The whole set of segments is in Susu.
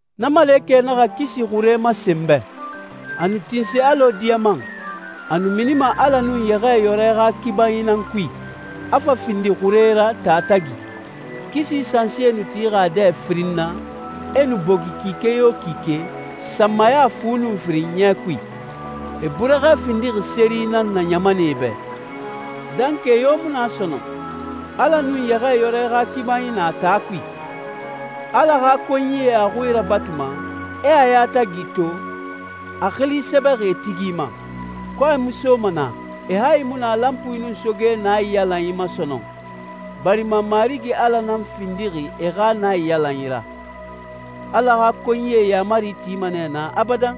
Na malekɛ naxa kisi xure masen n bɛ. A nu tinse alɔ diyaman, a nu minima Ala nun Yɛxɛɛyɔrɛ xa kibanyi nan kui, a fa findi xure ra taa tagi. Kisi sansie nu tixi a dɛ firin na, e nu bogi kike yo kike, sanmaya fu nun firin ɲɛ kui. E burɛxɛ findixi seri nan na ɲamanɛe bɛ. Dankɛ yo mu na sɔnɔn. Ala nun Yɛxɛɛyɔrɛ xa kibanyi na taa kui. Ala xa konyie a xui rabatuma, e a yatagi to, a xili sɛbɛxi e tigi ma. Kɔɛ mu soma naa, e hayi mu na lanpui nun soge naiyalanyi ma sɔnɔn, barima Marigi Ala nan findixi e xa naiyalanyi ra. Ala xa konyie yaamari tima nɛ naa abadan.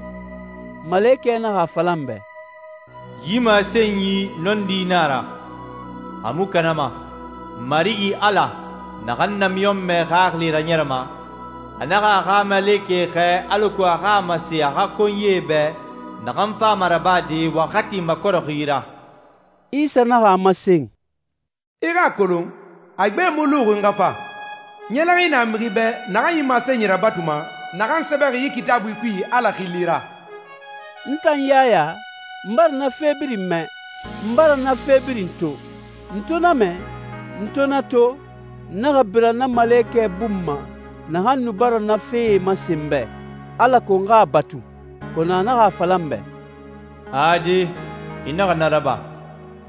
Malekɛ naxa a fala n bɛ, «Yi masenyi nɔndi nan a ra, a mu kanama. Marigi Ala, naxan namiɲɔnmɛ xaxili raɲɛrɛma, a naxa a xa malekɛ xɛɛ alako a xa a masen a xa konyie bɛ naxan fama rabade waxati makɔrɛxi ra.» Isa naxa a masen, «I xa a kolon, a gbe mu luxi n xa fa. Ɲɛlɛxinyi na mixi bɛ naxan yi masenyi rabatuma, naxan sɛbɛxi yi Kitaabui kui Ala xili ra.» N tan Yaya, n bara na fe birin mɛ, n bara na fe birin to. N to na mɛ, n to na to, n naxa bira na malekɛ bun ma naxan nu bara na fee masen n bɛ, alako n xa a batu. Kɔnɔ a naxa a fala n bɛ, «Ade, i naxa na raba.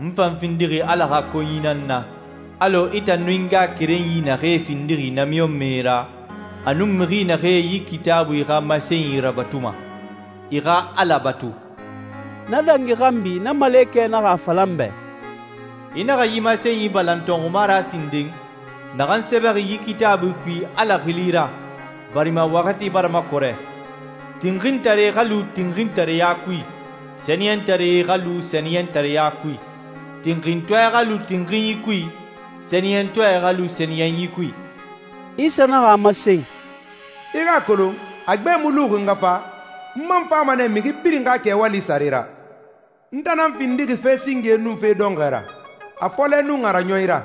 N fan findixi Ala xa konyi nan na alɔ i tan nun i ngaxakerenyi naxee findixi namiɲɔnmɛe ra, a nun mixi naxee yi Kitaabui xa masenyi rabatuma. I xa Ala batu.» Na dangi xanbi na malekɛ naxa a fala n bɛ, «I naxa yi masenyi balan tɔnxuma ra sinden, naxan sɛbɛxi yi Kitaabui kui Ala xili ra, barima waxati bara makɔrɛ. Tinxintare xa lu tinxintareya kui, sɛniyɛntare xa lu sɛniyɛntareɲa kui, tinxintɔɛ xa lu tinxinyi kui, sɛniyɛntɔɛ xa lu sɛniyɛnyi kui.» Isa naxa a masen, «I xa a kolon, a gbe mu luxi n xa fa, n man fama nɛ mixi birin xa kɛwali sare ra. N tan nan findixi fe singe nun fe dɔnxɔɛ ra, a fɔlɛ nun a raɲɔnyi ra.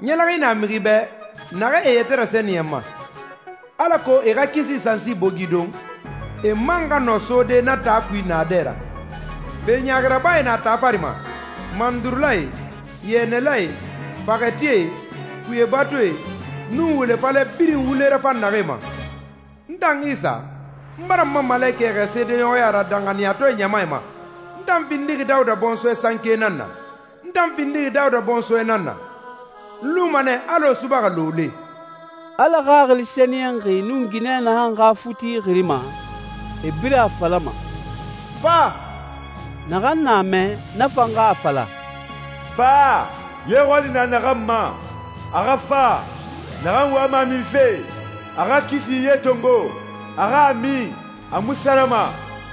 Ɲɛlɛxinyi na mixi bɛ naxee e yɛtɛ sɛniyɛnma, alako e xa kisi sansi bogi don, e man xa nɔ sode na taa kui naadɛ ra. Fe ɲaaxi rabae na taa fari ma, mandurulae, yɛnɛlae, faxɛtie, kuye batuie, nun wule falɛ birin wule rafan naxee ma. N tan Isa, n bara n ma malekɛ xɛɛ seedeɲɔxɔya ra danxaniyatɔɛ ɲamae ma. N tan findixi Dawuda bɔnsɔɛ sanke nan na, n tan findixi Dawuda bɔnsɔɛ nan na. N luma nɛ alɔ subaxɛ looloe.» Ala Xaxili Sɛniyɛnxi nun ginɛ naxan xa futi xirima, e birin a falama, «Fa.» Naxan na a mɛ, na fan xa a fala, «Fa! Ye xɔli na naxan ma, a xa fa. Naxan wama a minfe, a xa kisi ye tongo, a xa a min, a mu sarama!»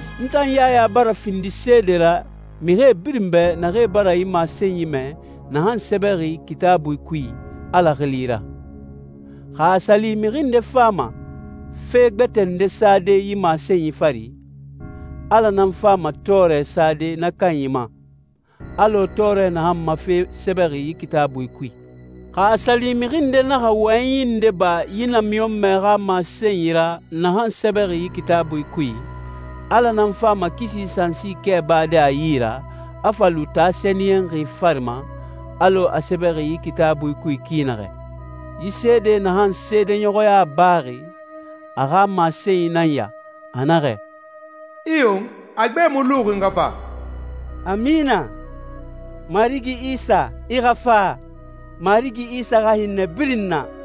N tan Yaya bara findi seede ra mixi birin bɛ naxee bara yi masenyi mɛ naxan sɛbɛxi yi Kitaabui kui Ala xili ra. Xa a sa li mixi nde fama fe gbɛtɛ nde sade yi masenyi fari, Ala nan fama tɔɔrɛ sade na kanyi ma, alɔ tɔɔrɛ naxan ma fe sɛbɛxi yi Kitaabui kui. Xa a sa li mixi nde naxa wɔyɛnyi nde ba yi namiɲɔnmɛ xa masenyi ra naxan sɛbɛxi yi Kitaabui kui, Ala nan fama kisi sansi kɛ bade a yi ra, a fa lu taa sɛniyɛnxi fari ma, alɔ a sɛbɛxi yi Kitaabui kui ki naxɛ. Yi seede naxan seedeɲɔxɔya baxi, a xa masenyi nan ya, a naxɛ, «Iyo, a gbe mu luxi n xa fa.» Amina. Marigi Isa, i xa fa! Marigi Isa xa hinnɛ birin na.